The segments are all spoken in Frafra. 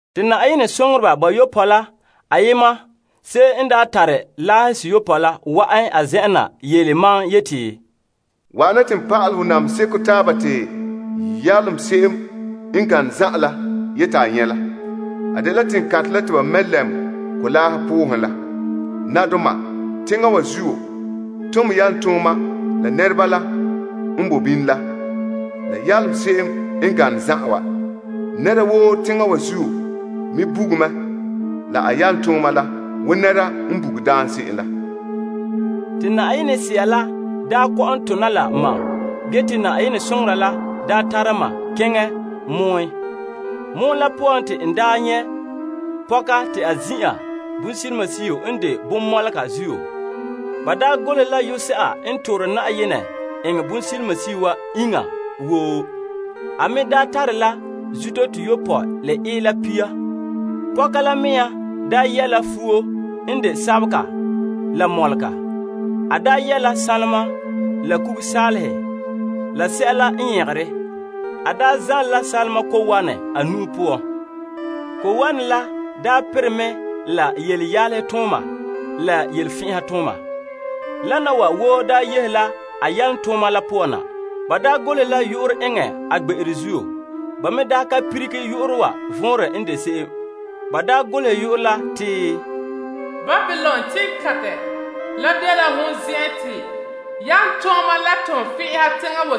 Te Yenɛ soŋoreba bayopɔe la ayema, se'em n tare laahe seyopɔe la wa'an n zen'en na yele mam yeti, Wa'ana te n pa'alɛ hɔ namehe seko taaba te yaloma se'em n gane zan'an la yeti a nyɛ' la. A dela teŋkantɛ la te ba mɛ lɛm kolaahe poohen la. Nabadoma teŋa wa zuo tom yalomtooma la nɛreba la n boe bini la la yaloma se'em n gane zan'an wa. Teŋa wa zuo nɛreba buge mɛ la a yalomtooma wo nɛra n buge daam se'em la. Te Yenɛ Sea la kɔ'ɔn tona la mam ge te Yenɛ soŋora la tara ma keŋɛ pɔgɔtia poan ha. Pɔgɔtia la poan te n nyɛ' pɔka te a zin'an bonsilimasio n de bonmɔlega zuo. Ba golehɛ la yu'urɛ se'a n toore Yenɛ eŋɛ bonsilimasio wa iŋa woo. A me tare la zuto toyopɔe la ila pia. Pɔka la mea yɛ' la fuo n de sabega la mɔlega. A yɛ la sanlema la sanlenkuga la kugasaalehe. A zanle la sanlema ko'wanɛ a nu'o poan. Ko'wanɛ la perɛ mɛ la yelenyalehetooma la yelefɛn'ɛhatooma. Wana wa woo daa yehe la a yalomtooma la poan na. Ba daa golehɛ la yu'urɛ eŋɛ a gbe'ere zuo. Ba me ka lilige yu'urɛ wa vɔnrɛ n de se'em. Ba golehɛ yu'urɛ la te, Babilon teŋkantɛ, teŋa wa zuo yaalegɔ la toonfɛn'ɛha zan'an ma'.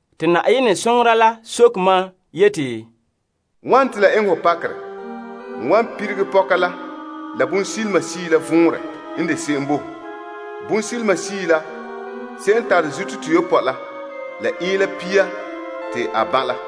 Te Yenɛ soŋora la soke mam yeti, Wane te la eŋɛ hɔ pakerɛ? N wan lilige pɔka la, la bonsilimasio la vɔnrɛ n de se'em bo ho. Bonsilimasio la, se'em n tare zuto toyopɔe la ila pia te a ban' la.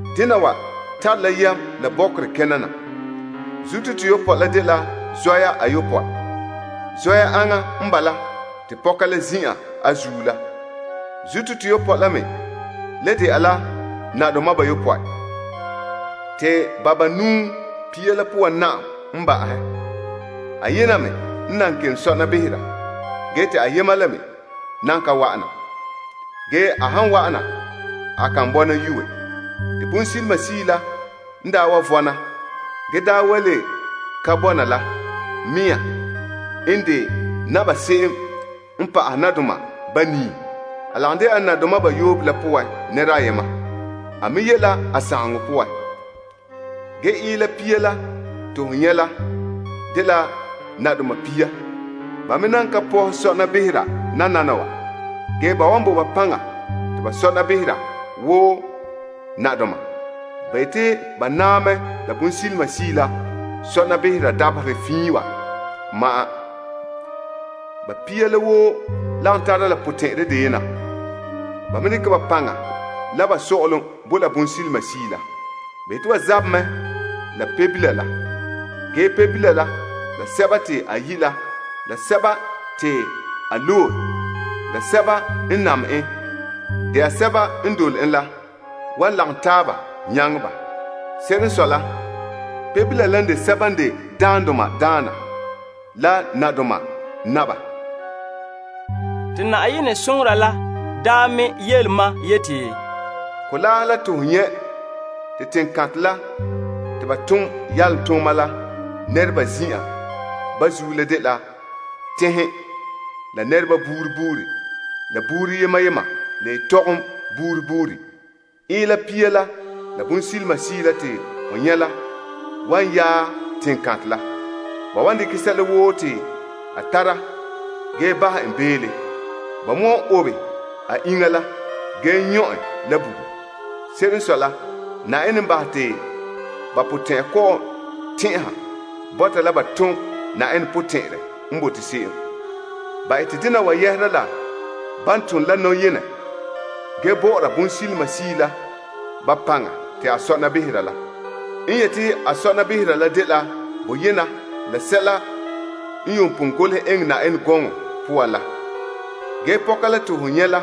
Dena wa tare la yam la bɔkerɛ kena na. Zuto toyopɔe la dela zɔya ayopɔe. Zɔya aŋa n bala, te pɔka la zin'an a zuo la. Zuto toyopɔe la me le dɛna la nadoma bayopɔe. Te banuu pia la poan na'am n ba'ahɛ. Ayena me n nan kelom sɔna behera ge te ayema le me, nan ka wa'ana. Ge a han wa'an, a kan bɔna yue. Te bonsilimasio la n daa wa vɔna, ge daa wa le ka bɔna la mɛŋa n de naba se'em n pa'ahɛ nadoma banii. A lagom de'a la nadoma bayopɔe la nɛra ayema. A me ye' la sagaŋɔ poan. Ge ila pia la te ho nyɛ' la, dela nadoma pia. Ba me nan ka pɔhɛ sɔna behera nana. Ge ba wan bo ba paŋa te ba sɔna behera wo nadoma. Ba yeti ba naa mɛ la bonsilimasio la sɔna behera dabaherɛ fiin wa ma'an. Ba pia la woo lagom tara la potɛn'ɛrɛ deyena. Ba me dekɛ ba paŋa, la ba sɔ'ɔlom bo la bonsilimasio la. Ba yeti ba zabɛ mɛ la Pebila la. Ge Pebila la, la sɛba te a yi', la sɛba te a loe la, la sɛba n de birikindoma wan lagom taaba nyaŋɛ ba. Se'ere n sɔe la, Pebila la n de sɛba n de Daandoma la Daana, la Nabadoma Naba. Te Yenɛ soŋora la me daa yele ma yeti, Kolaahe la te ho nyɛ' te teŋkantɛ la te yaloma la zin'an bo zuo la dela tenhen, la nɛreba buuri buuri, la buuri yema yema, la yetɔgom buuri buuri. Ila pia la, la bonsilimasio la te ho nyɛ' la wan yaɛ yaloma la. Ba wan dekɛ sɛla woo te a tara ge bahɛ en beele. Ba me wan obe a iŋa la ge nyɔ' en la bugum. Se'ere n sɔe la, Yenɛ n bahɛ te ba potɛn'ɛra kɔ'ɔn tɛn'ɛha bɔta la ba tom Yenɛ potɛn'ɛrɛ n bote se'em. Ba ete dena wa yɛhera la ban tone la nɔyenɛ ge bɔ'ɔra bonsilimasio la ba paŋa te a sɔna behera la. N yete a sɔna behera la dela boyena la sɛla yuun pon golehɛ eŋɛ Yenɛ gɔŋɔ poan la. Ge pɔka la te ho nyɛ' la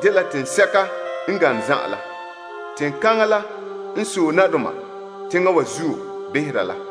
dela teŋsɛka n gane zan'an la. Teŋkaŋa la n sɔe nadoma teŋa wa zuo behera la.